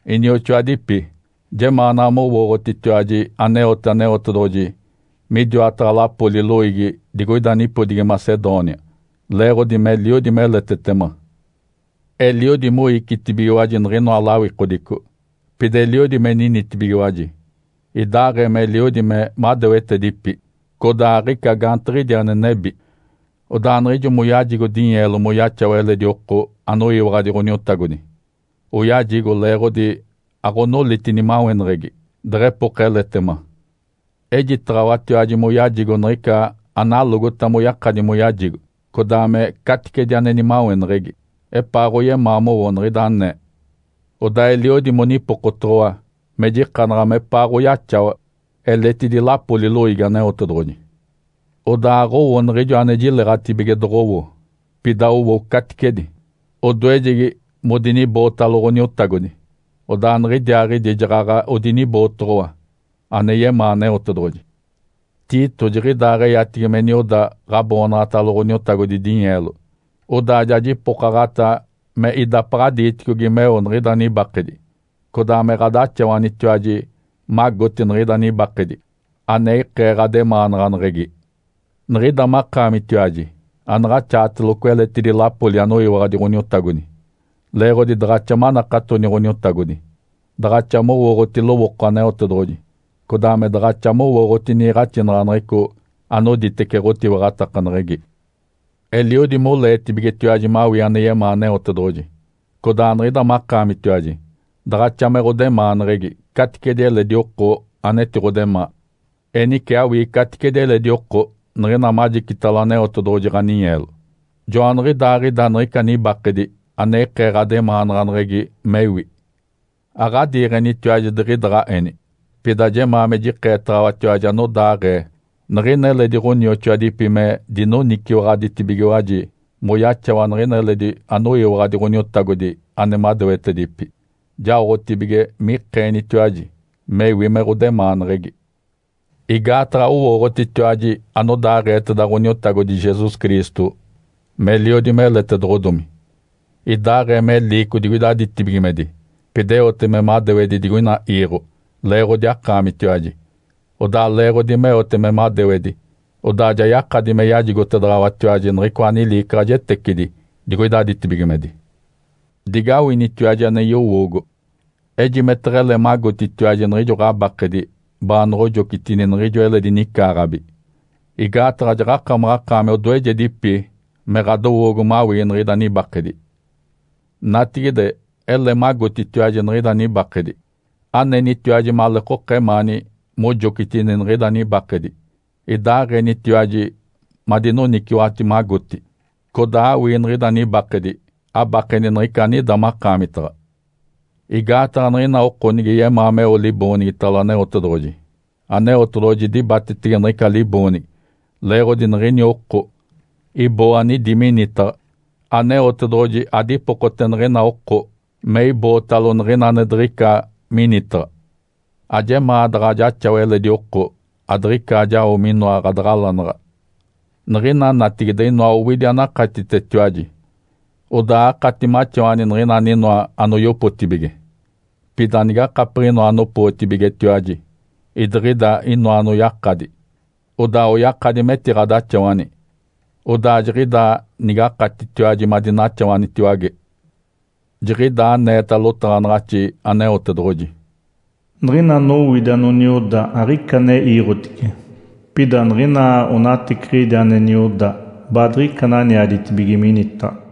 Inioxoadipi, jemaanaɡ̶a mowooɡ̶otitiwaji aneote Aneotedoɡ̶oji midiwataɡ̶a lapoli loiigi digoida nipodigi Macedônia leeɡ̶odi meliodi meletetema. Eliodi moicitibigiwaji niɡ̶inoa lawikodico. Pida eliodi me ninitibigiwaji, idaaɡ̶ee meliodi me madewetedipi codaa aɡ̶ica gaantiɡ̶idi ane nebi. Odaa niɡ̶ijo moyajigo dinyeelo moyaxawa eledi oko anoyiwaɡ̶adi Ǥoniotagodi, oyajigo leeɡ̶odi aɡ̶onoliti nimaweneɡ̶egi deɡ̶epoka eletema. Ejitaɡ̶awatiwaji moyajigo niɡ̶ica analogota moyakadi moyajigo, codaa me caticedi ane nimaweneɡ̶egi, epaaɡ̶oyemaa mowo niɡ̶ida anee. Odaa eliodi monipokotoɡ̶owa me jikanaɡ̶a mepaaɡ̶oyaxawa eletidi lapoli loiigi Aneotedoɡ̶oji. Odaa aɡ̶owo niɡ̶ijo ane jileɡ̶atibige doɡ̶owo, pida owo caticedi. Odoejegi modinibootalo Ǥoniotagodi, odaa niɡ̶idiaaɡ̶idi jaɡ̶aɡ̶a odinibootoɡ̶owa, ane yemaa Aneotedoɡ̶oji. Tito jiɡ̶idaaɡ̶eyatigi me nioda ɡ̶aboonaɡ̶atalo Ǥoniotagodi dinyeelo. Odaa ja jipokaɡ̶ata me idapaɡ̶a diiticogi meo niɡ̶ida nibakedi, codaa me ɡ̶adaxawanitiwaji magoti niɡ̶ida nibakedi ane ikee ɡ̶ademaanaɡ̶aneɡ̶egi. Niɡ̶ida makaamitiwaji anaɡ̶axaateloco eletidi lapoli anoyiwaɡ̶adi Ǥoniotagodi. Leeɡ̶odi daɡ̶axa manakatoni Ǥoniotagodi, daɡ̶axa mowooɡ̶oti lowooko Aneotedoɡ̶oji, codaa me daɡ̶axa mowooɡ̶oti niiɡ̶axinaɡ̶aneɡ̶eco anoditece ɡ̶otiwaɡ̶atakaneɡ̶egi. Eliodi moleetibigetiwaji mawii ane yemaa Aneotedoɡ̶oji, codaa niɡ̶ida makaamitiwaji daɡ̶axa me ɡ̶odemaaneɡ̶egi caticedi eledi oko anetiɡ̶odemaa. Enice awii caticedi eledi oko niɡ̶ina majicitalo Aneotedoɡ̶oji ɡ̶aninyeelo. Joaniɡ̶idaaɡ̶ida niɡ̶ica nibakedi ane ikee ɡ̶ademaanaɡ̶aneɡ̶egi mewi. Aɡ̶adiiɡ̶enitiwaji diɡ̶idaɡ̶a eni. Pida jemaa me jikeetaɡ̶awatiwaji anodaaɡ̶ee niɡ̶ina eledi ɡ̶onioxoadipi me dinoniciwaɡ̶aditibigiwaji moyaxawa niɡ̶ina eledi anoyiwaɡ̶adi Ǥoniotagodi ane madewetedipi, jaotibige mikeenitiwaji mewi me ɡ̶odemaaneɡ̶egi. Igaataɡ̶a owooɡ̶otitiwaji anodaaɡ̶eeteda Ǥoniotagodi Jesus Cristo meliodi meletedoɡ̶odomi. Idaaɡ̶ee me liico digoida ditibigimedi, pida eote me madewedi digoina iiɡ̶o leeɡ̶odi akaamitiwaji. Odaa leeɡ̶odi meote me madewedi, odaa ja yakadi me yajigotedaɡ̶awatiwaji niɡ̶icoa niliicaɡ̶ajetecidi digoida ditibigimedi. Digawinitiwaji ane yowoogo. Ejime teɡ̶ele magotitiwaji niɡ̶ijo ɡ̶abakedi baanoɡ̶ojocitini niɡ̶ijo eledi nicaaɡ̶abi. Igaataɡ̶a jaɡ̶akamaɡ̶akaami odoejedipi me ɡ̶adowoogo mawii niɡ̶ida nibakedi. Natigide, ele magotitiwaji niɡ̶ida nibakedi. Anenitiwaji maleekoka emaani mojocitini niɡ̶ida nibakedi, idaaɡ̶enitiwaji madinoniciwaɡ̶ati magoti, codaa awii niɡ̶ida nibakedi abakeni niɡ̶ica anidi makaamitaɡ̶a. Igaataɡ̶a niɡ̶ina oko nige yemaa meo liboonigitalo Aneotedoɡ̶oji, Aneotedoɡ̶oji dibatetege niɡ̶ica liboonigi leeɡ̶odi niɡ̶ini oko iboo anidi minitaɡ̶a. Aneotedoɡ̶oji adipokote niɡ̶ina oko me ibootalo niɡ̶ina ane diɡ̶ica minitaɡ̶a. Ajemaa daɡ̶a jaxawa eledi oko adiɡ̶ica jao minoa ɡ̶adaɡ̶alanaɡ̶a. Niɡ̶ina natigide inoa owidi anakatitetiwaji, odaa akati maxawani niɡ̶ina aninoa anoyopotibige. Pida nigakapiɡ̶inoa anopootibigetiwaji, idiɡ̶idi inoa anoyakadi, odaa oyakadi metiɡ̶adaxawani. Odaa jiɡ̶idaa nigakatitiwaji madinaxawanitiwage. Jiɡ̶idaa aneeta lotaɡ̶anaɡ̶axi Aneotedoɡ̶oji, “Niɡ̶ina anowidi ane nioda aɡ̶ica ane iiɡ̶otice, pida niɡ̶ina anonateciɡ̶idi ane nioda baadiɡ̶ica ananiaditibige minitaɡ̶a.”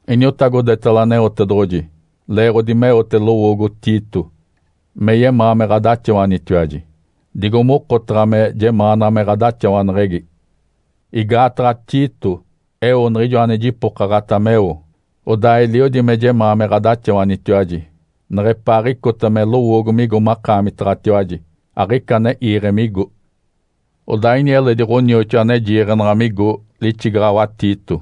Iniotagodetalo Aneotedoɡ̶oji leeɡ̶odi meote lowoogo Tito me yemaa me ɡ̶adaxawanitiwaji, digo mokotaɡ̶a me jemaanaɡ̶a me ɡ̶adaxawaneɡ̶egi. Igaataɡ̶a Tito eo niɡ̶ijo ane jipokaɡ̶ata meo, odaa eliodi me yemaa me ɡ̶adaxawanitiwaji neɡ̶epaaɡ̶icota me lowoogo migo makaamitaɡ̶atiwaji aɡ̶ica ane iiɡ̶e migo. Odaa ini eledi ɡ̶onioxoa ane jiiɡ̶enaɡ̶a migo lixigaɡ̶awa Tito.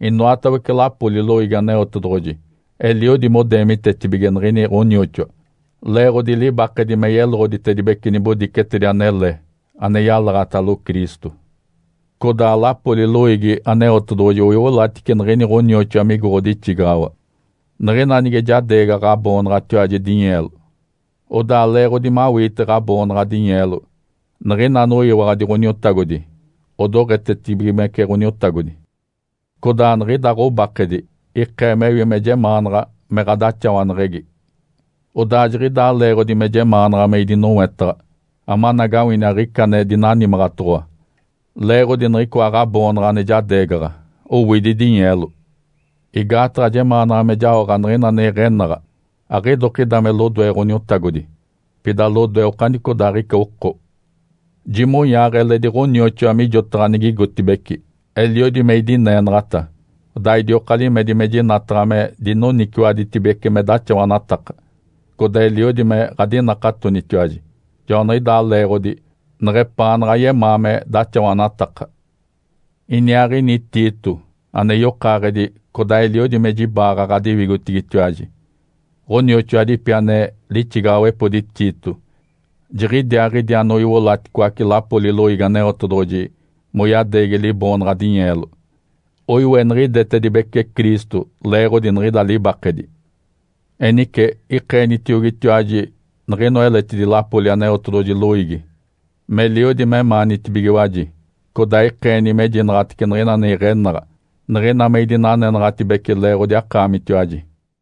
Inoatawece lapoli loiigi Aneotedoɡ̶oji eliodi modeemitetibige niɡ̶ini ɡ̶onioxoa leeɡ̶odi libakedi me yeloɡ̶oditedibece nibodicetedi anele ane yalaɡ̶atalo Cristo. Codaa lapoli loiigi Aneotedoɡ̶oji oiolatice niɡ̶ini ɡ̶onioxoa migo ɡ̶odixigaɡ̶awa, niɡ̶ina nige jadeegaɡ̶a ɡ̶aboonaɡ̶atiwaji dinyeelo. Odaa leeɡ̶odi mawiite ɡ̶aboonaɡ̶a dinyeelo, niɡ̶ina anoyiwaɡ̶adi Ǥoniotagodi odoɡ̶etetibigimece Ǥoniotagodi, codaa niɡ̶ida ɡ̶obakedi ikee mewi me jemaanaɡ̶a me ɡ̶adaxawaneɡ̶egi. Odaa jiɡ̶idaa leeɡ̶odi me jemaanaɡ̶a me idinowetaɡ̶a amanagawini aɡ̶ica ane dinanimaɡ̶atoɡ̶owa leeɡ̶odi niɡ̶icoa ɡ̶aboonaɡ̶a ane jadeegaɡ̶a, owidi dinyeelo. Igaataɡ̶a jemaanaɡ̶a me jaoɡ̶a niɡ̶ina ane iɡ̶enaɡ̶a, aɡ̶idokida me lodoe Ǥoniotagodi, pida lodoe okanicodaaɡ̶ica oko. Jimonyaaɡ̶a eledi ɡ̶onioxoa mijotaɡ̶a nigigotibeci. Eliodi me idineenaɡ̶ata, odaa idioka limedi me jinataɡ̶a me dinoniciwaɡ̶aditibece me daxawanataka. Codaa eliodi me ɡ̶adinakatonitiwaji, joaniɡ̶idaa leeɡ̶odi neɡ̶epaanaɡ̶a yemaa me daxawanataka. Iniaaɡ̶ini Tito ane yokaaɡ̶edi, codaa eliodi me jibaaɡ̶a ɡ̶adiwigotigitiwaji. Ǥonioxoadipi ane lixigaɡ̶awepodi Tito, jiɡ̶idiaaɡ̶idi anoiolaticoace lapoli loiigi Aneotedoɡ̶oji moyadeegi liboonaɡ̶a dinyeelo. Oiweniɡ̶idetedibece Cristo leeɡ̶odi niɡ̶ida libakedi. Enice ikeenitiogitiwaji niɡ̶inoa eletidi lapoli Aneotedoɡ̶oji loiigi meliodi memaanitibigiwaji, codaa ikeeni mejinaɡ̶atece niɡ̶ina ane iɡ̶enaɡ̶a, niɡ̶ina me idinanenaɡ̶atibece leeɡ̶odi akaamitiwaji.